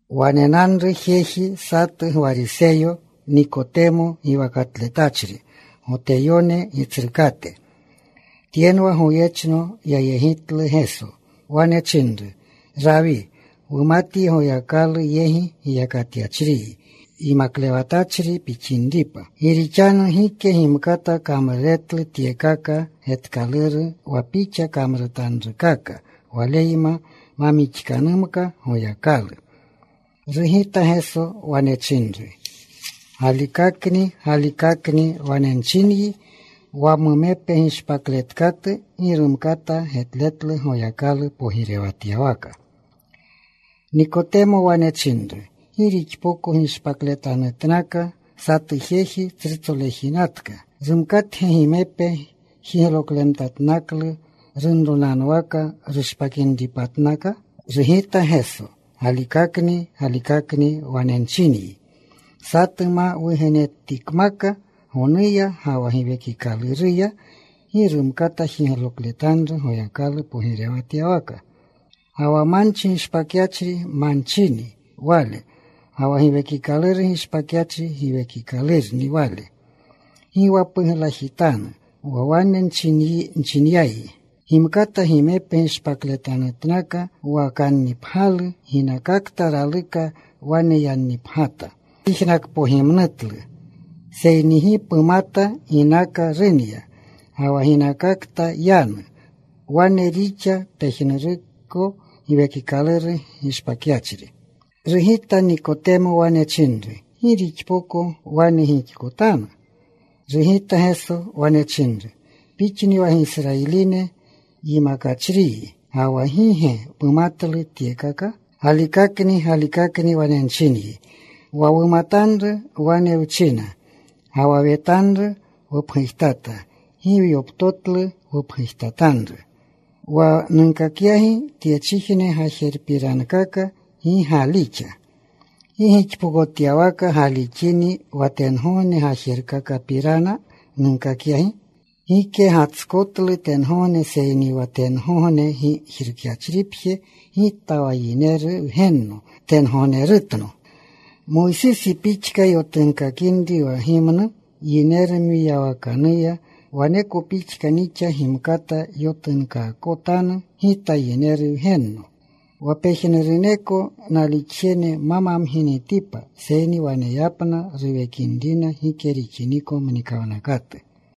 Wanenanru jeji satu Gwariseyo, Nikotemo giwakatletachri. Goteyone gitsrukate. Tyenwa goyechno yayegitlu Geso. Wane chinru, “Rawi, wumatyi Goyakalu yegi ginyachriyi yimaklewatachri pixinripa. Gi rixanu gike gimkata kamruretlu tyekaka getkaluru wa Pixa kamrutanrukaka waleyma ma mixkanumka Goyakalu.” Rugita Geso. Wane chinru, “Galikakni, galikakni wane nchinyi, wa mumepe gishpakletkatu gi rumkata getletlu Goyakalu pogirewatyawaka.” Nikotemo wane chinru, “¿Gi rixpoko gishpakletatnaka satu jeji tsrutsolejinatka? ¿Rumkatge gimepe jiglokletanutnaklu runronanwaka, rushpakinripatnaka?” Rugita Geso, “Galikakni, galikakni wane nchinyi, satu ma wugenetikmaka gonuya ga wa Giwekikaluruya, gi rumkata jiglokletanru Goyakalu pogirewatyawaka. Ga wa manchi gishpakyachri manchini wale, ga wa Giwekikaluru gishpakyachri, giwekikalurni wale. Gi wa puglajitanu wa wane nchinyayi, gimkata gimepe gishpakletanutnaka. Wa kannipgyalu ginakakta raluka wane yannipgyata. Pyijnakpogimnutlu, seyni gi pumata ginakakta runya, ga wa ginakakta yanu. Wane rixa pejnuruko Giwekikaluru gishpakyachri.” Rugita Nikotemo. Wane chinru, “¿Gi rixpoko wane gixkotanu?” Rugita Geso. Wane chinru, “¿Pixni wa Gisrayiline yimakachriyi, ga wa gi ge pumatlu tyekaka? Galikakni, galikakni wane nchinyi, wa wumatanru wane wchina, ga wa wetanru wupgujtata. Gi gyoptotlu wupgujtatanru. Wa nunkakingi tyechijne gajerupirankaka, gi galixa, ¿gi gixpokotyawaka galixini wa tengogne gajerupirankaka nunkakingi? Gike gatskotlu tengogne, seyni wa tengogne gijrukyachripje, Gita wa Yineru Wgenno tengognerutno. Moysisi pixka yotunkakinri wa gimnu yineru mwiyawakanuya, waneko pixka nixa: numkata yotunkaakotanu Gita Yineru Wgenno. Wa pejnuruneko nalixjene ma mamginitipa, seyni waneyapna ruwekinrina gike rixiniko mnikawnakatu.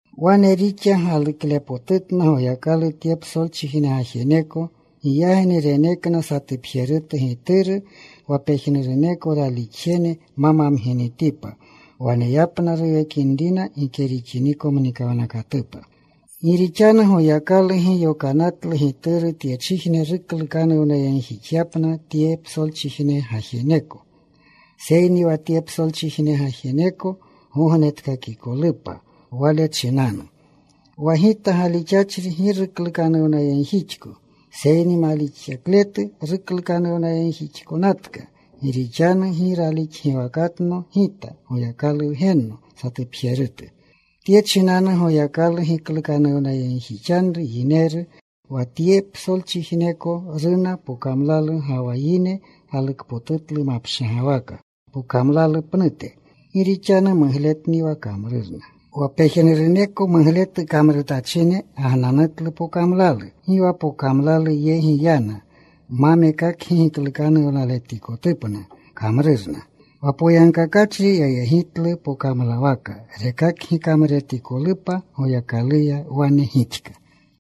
“Wane rixa galuklepotutna Goyakalu tye psolchijne gajeneko, giyagni renekna satupjerutu Gituru, wa pejnuruneko ralixjene ma mamginitipa, wa waneyapna ruwekinrina gike rixiniko mnikawnakatupa. Gi rixanu Goyakalu gi yokanatlu Gituru tyechijne ruklukanuwnayegjixyapna tye psolchijne gajeneko, seyni wa tye psolchijne gajeneko gognetkakikolupa Wale chinanu. Wa Gita galixachri gi ruklukanuwnayegjixko. Seyni malixakletu ruklukanuwnayegjixkanatka gi rixanu gi ralixgiwakatno Gita Goyakalu Wgenno satupjerutu. Tye chinanu Goyakalu giklukanuwnayegjixanru yineru, wa tye psolchijneko runa pokamlalu, ga wa yine galukpotutlu mapshagwaka pokamlalu pnute, gi rixanu mugletni wa kamrurna. Wa pejnuruneko mugletu kamrutachine gagnanutlu pokamlalu. Gi wa pokamlalu yegi yana ma mekakgi giklukanuwnaletikotupna kamrurna. Wa poyagkakachrii yayegitlu pokamlawaka, rekakgi kamruretikolupa Goyakaluya wane gixka.”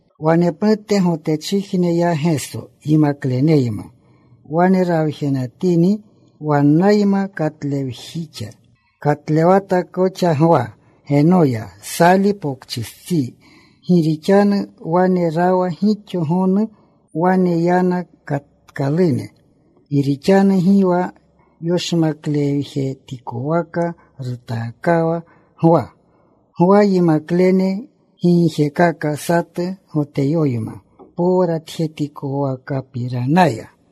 Wanepnute Gotechijne ya Geso yimakleneyma. Wane rawjenatini wannayma. Katlewjixa. Katlewata koxa Gwa Genoya, Sali Pokchistsi, gi rixanu wane rawa gixo gonu. Wane yana. Katkalune. Gi rixanu gi wa yoshmaklewjetikwaka rutaakawa Gwa. Gwa yimaklene gigjekaka satu Goteyoyma powratjetikwakapiranaya.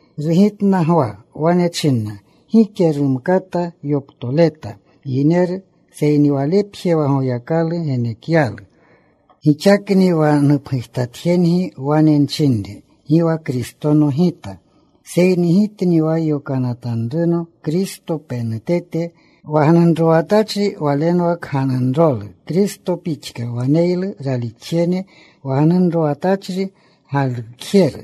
Rugitna Gwa. Wane china, “Gike rumkata yoptoleta yineru, seyni walepje wa Goyakalu genekyalu. Gixakni wa nupgujtatjengi wane nchinre, ‘Gi wa Kristono gita,’ seyni gitni wa yokanatkalurno Kristo penutete. Wa gnunrowatachri walenwa kganunrolu, Kristo pixka waneylu ralixjene. Wa gnunrowatachri galukjeru,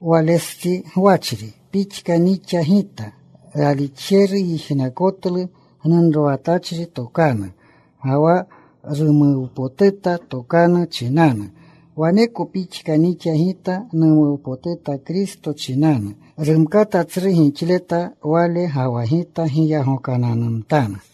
walestsi gwachri, pixka nixa gita. Ralukjeru yijnakotlu gnunrowatachri tokanu, ga wa rumuwpotuta tokanu chinanu. Waneko pixka nixa gita. Numuwpotuta Kristo chinanu. Rumkata tsru gixleta Wale, ga wa gita giyagokananumtanu.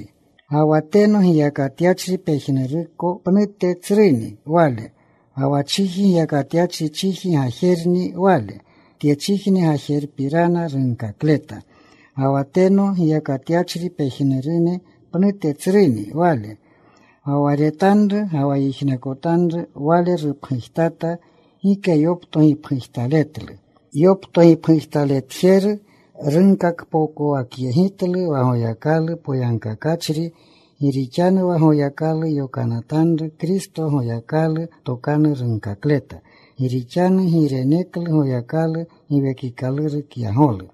“Ga wa teno giyakatyachri pejnuruneko pnute tsruni Wale. Ga wa chiji giyakatyachri, chiji gajerni wale. Tye chiji gajerupirana runkakleta. Ga wa tengogne giyakatyachri pejnurune pnute tsruni Wale. Ga wa retanru, ga wa yijnakotanru Wale rupgujtata. Gike yopto gipgujtaletlu. Yopto gipgujtaletjeru runkakpokowakyegitlu wa Goyakalni wa poyagkakachri. Gi rixanu wa Goyakalu yokanatanru, Kristo, Goyakalu tokanu runkakleta. Gi rixanu gi reneklu Goyakalu Giwekikaluru kyagolu.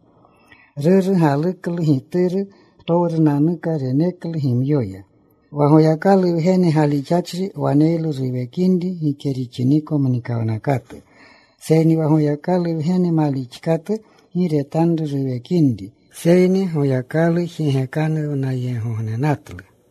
Ruru galuklu Gituru. Ptowrunanuka reneklu gimyoya. Wa Goyakalu Wgene galixachri waneylu ruwekinri gike rixiniko mnikawnakatu. Seyni wa Goyakalu Wgene malixkatu gi retanru ruwekinri, seyni Goyakalu jigekanuwyeegognenatlu.”